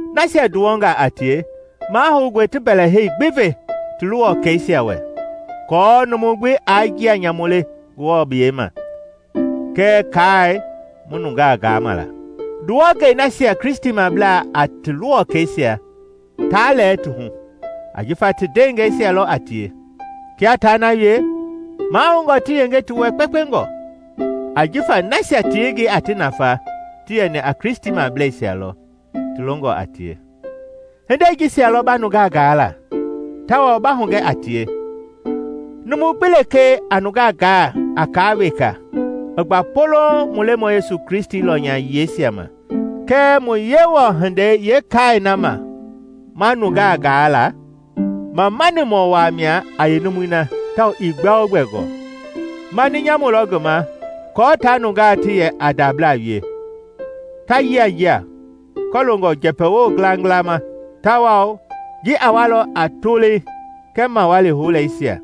Nasia nduwɔngaa a tie, mahoungɔe ti mbɛɛhei gbi ve ti luwɔkɛisia wɛ aako numu gbi aa njia nyamu le Ngewɔ biyɛi ma kɛɛ kaai mu nungaa gaama la. Nduwɔngei nasia Kristimablaa a ti luwɔkɛisia taa lɛɛ ti hu, ajifa ti ndeengɛisia lɔ a tie. Kia taa na wie, mahoungɔ ti yenge ti wɛ kpekpengɔ, ajifa nasia ti yengei a ti nafa ti yɛni a Kristimableisia lɔ ti longɔ a tie. Hindei jisia lɔ ba nungaa gaa la, tawao ba hugɛ a tie. Numu gbi lekee a nungaa gaa a kaa weka i gba polouŋ mu Lemɔi Yesu Kristi lɔnya yiɛisia ma kɛɛ mu Yewɔhindei yeekaai na ma nungaa gaa la, mamanimɔ waa mia a yeenumui na tawao ii gbɛogbɛ gɔɔ. Mani nyamu lɔ ngi ma kɔɔ taa nungaa ti yɛ a ndabla wie, ta yianjia kɔloongɔ njɛpɛwo ngilangila ma, tawao ji a walɔ a tolei kɛɛ mawali houleisia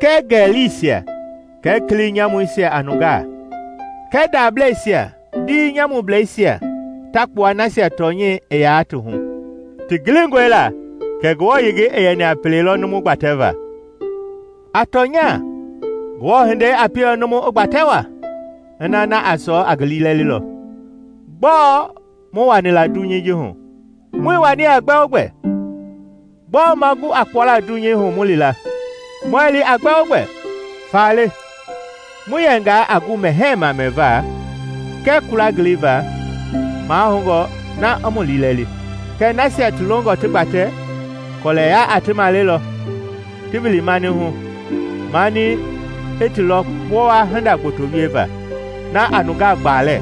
kɛɛ ngɛlisia kɛɛ kili nyamuisia a nungaa, kɛɛ ndableisia ndiima nyamublɛisia ta kpua nasia tɔnyɛi ii yaa ti hu. Ti gilingɔe la kɛ Ngewɔ yengei i yɛni a pele lɔ numu gbatɛva. A tɔnya, Ngewɔ hindei a pielɔ numu i gbatɛ waa ina na a sɔɔ a ngi liilɛlilɔ. Gbɔɔ mu wani la dunyei ji hu? Muii wani a gbɛogbɛ! Gbɔɔ ma gu a kpuala dunyei hu mu li la? Muɛɛ li a gbɛogbɛ! Faale, mu yɛngaa a gu mɛhɛɛ ma mɛva kɛɛ kula ngiliva, mahoungɔ na i mu liilɛli. Kɛɛ nasia ti longɔ ti gbatɛ, kɔlɛya a ti maleilɔ, ti wili mani hu, mani i ti lɔ kpowa hinda gboto wieva na a nungaa gbaalɛ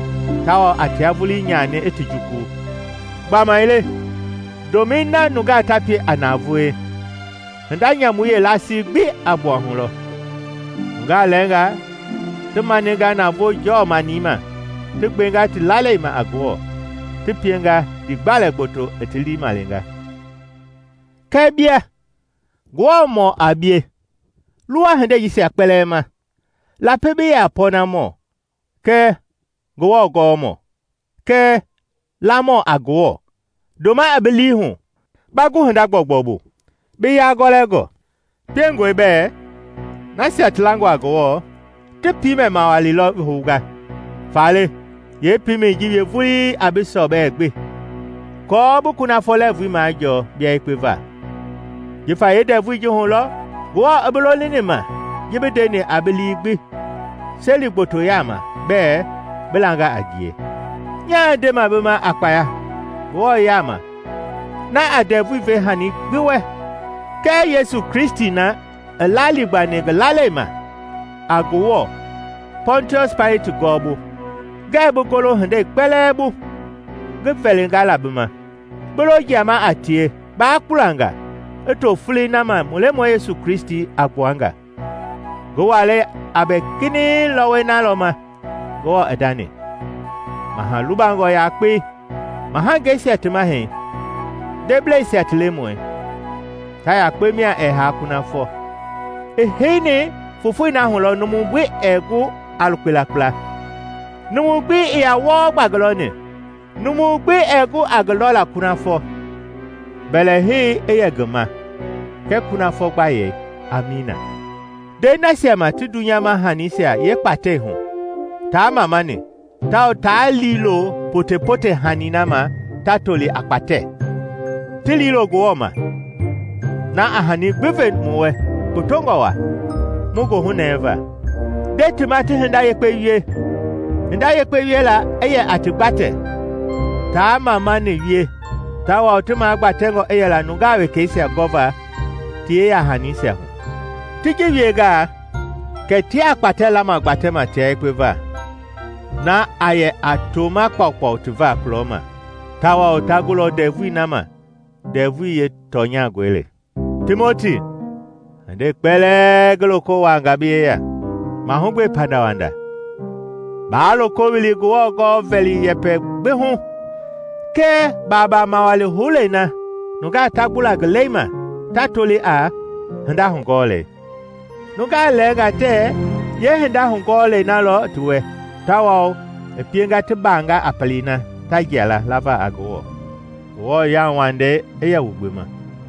tawao a tia vulii nyani i ti juku. Gbamaile ndomɛi na nungaa ta pie a navoei, hinda nyamui yeelasii gbi a gbua hu lɔ. Nungaa lɛɛngaa ti maninga navoo jɔɔ-manii ma ti gbenga ti lalei ma a Ngewɔ ti pienga ndiigbalɛ gboto i ti lii malenga. Kɛɛ bia, Ngewɔmɔ a bie, luwa hindei jisia kpɛlɛɛ ma. Lapi bi yɛ a pɔɔnamɔ, kɛɛ Ngewɔ gɔmɔ, kɛɛ lamɔ a Ngewɔ, ndoma i bi lii hu, ba gu hinda gbɔugbɔu bu, bi yagɔlɛngɔ. Piengɔe bɛɛ nasia ti langɔ a Ngewɔ ti piimɛ-mawali lɔ hounga; faale yeepiimɛi ji wie vulii a bi sɔbɛi gbi aako bi kunafɔ lɛɛvui majɔɔ bia yekpe va; jifa yeendɛvui ji lɔ Ngewɔ i bi lolini ma ji bi ndeni a bi lii gbi seli gboto yaama bɛɛ bi langa a ngie. Nyaa ndema bi ma a kpaya Ngewɔ yaama na a ndɛvui ve hani gbi wɛ kɛɛ Yesu Kristi na i laaligbani ngi lala ma a Ngewɔ Pɔntiɔsi Paileti gɔɔbu, ngɛɛ bi golo hindei kpɛlɛɛ bu ngi vɛlinga la bi ma, bi lo jiama a tie, baa kpulanga, i to folei nama mu Lemɔi Yesu Kristi a gbua nga. Ngi walɛi a bɛ kinɛiŋ lɔwɔi na lɔ ma Ngewɔ i ndani, Maha lubangɔ yakpei, mahangeisia ti Mahɛi, ndebleisia ti Lemɔi, ta yakpe mia ɛɛ haa kunafɔ; i heini fofoi na hu lɔ numu gbi ɛɛ gu a lukpela kpla. Numu gbi ii yaa wɔɔ gba ngi lɔni; numu gbi ɛɛ gu a ngi lɔla kunafɔ. Mbɛlɛhei i yɛ ngi ma kɛɛ kunafɔ gbayei! Amiina. Nde nasia ma ti dunyama hanisia yeekpatɛi hu taa mamani tawao taa liilo potepote hani na ma ta toli a kpatɛ, ti liilo Ngewɔ ma, na a hani gbi ve mu wɛ kpotongɔ waa mu goohu nɛva. Nde ti ma ti hinda yekpe wie, hinda yekpe wiela i yɛ a ti gbatɛ, taa mamani wie tawao ti magbatɛngɔ i yɛla nungaa wekɛisia gɔva ti yeyahanisia hu. Ti ji wiengaa kɛ tiaa kpatɛ lama gbatɛma tia yekpe va, na a yɛ a toma kpaukpau ti va kulɔma; tawao ta gulɔ ndɛvui na ma ndɛvui yeetɔnyangɔi le. Timoti, hindei kpɛlɛɛ ngi toko wuanga bi yeya, mahugbe pandawanda. Baa loko wili Ngewɔ-gɔɔ-vɛli yɛpɛ gbi hu kɛɛ baabaa mawali houlei na nungaa ta gbula ngi lɛi ma ta toli a “Hinda hugɔɔlei.” Nungaa lɛɛngaa tɛɛ yeehinda hugɔɔlɛi na lɔ ti wɛ, tawao i pienga ti baanga a pelei na ta jia la lava a Ngewɔ. Ngewɔ yauwandei i yɛ wu gbi ma.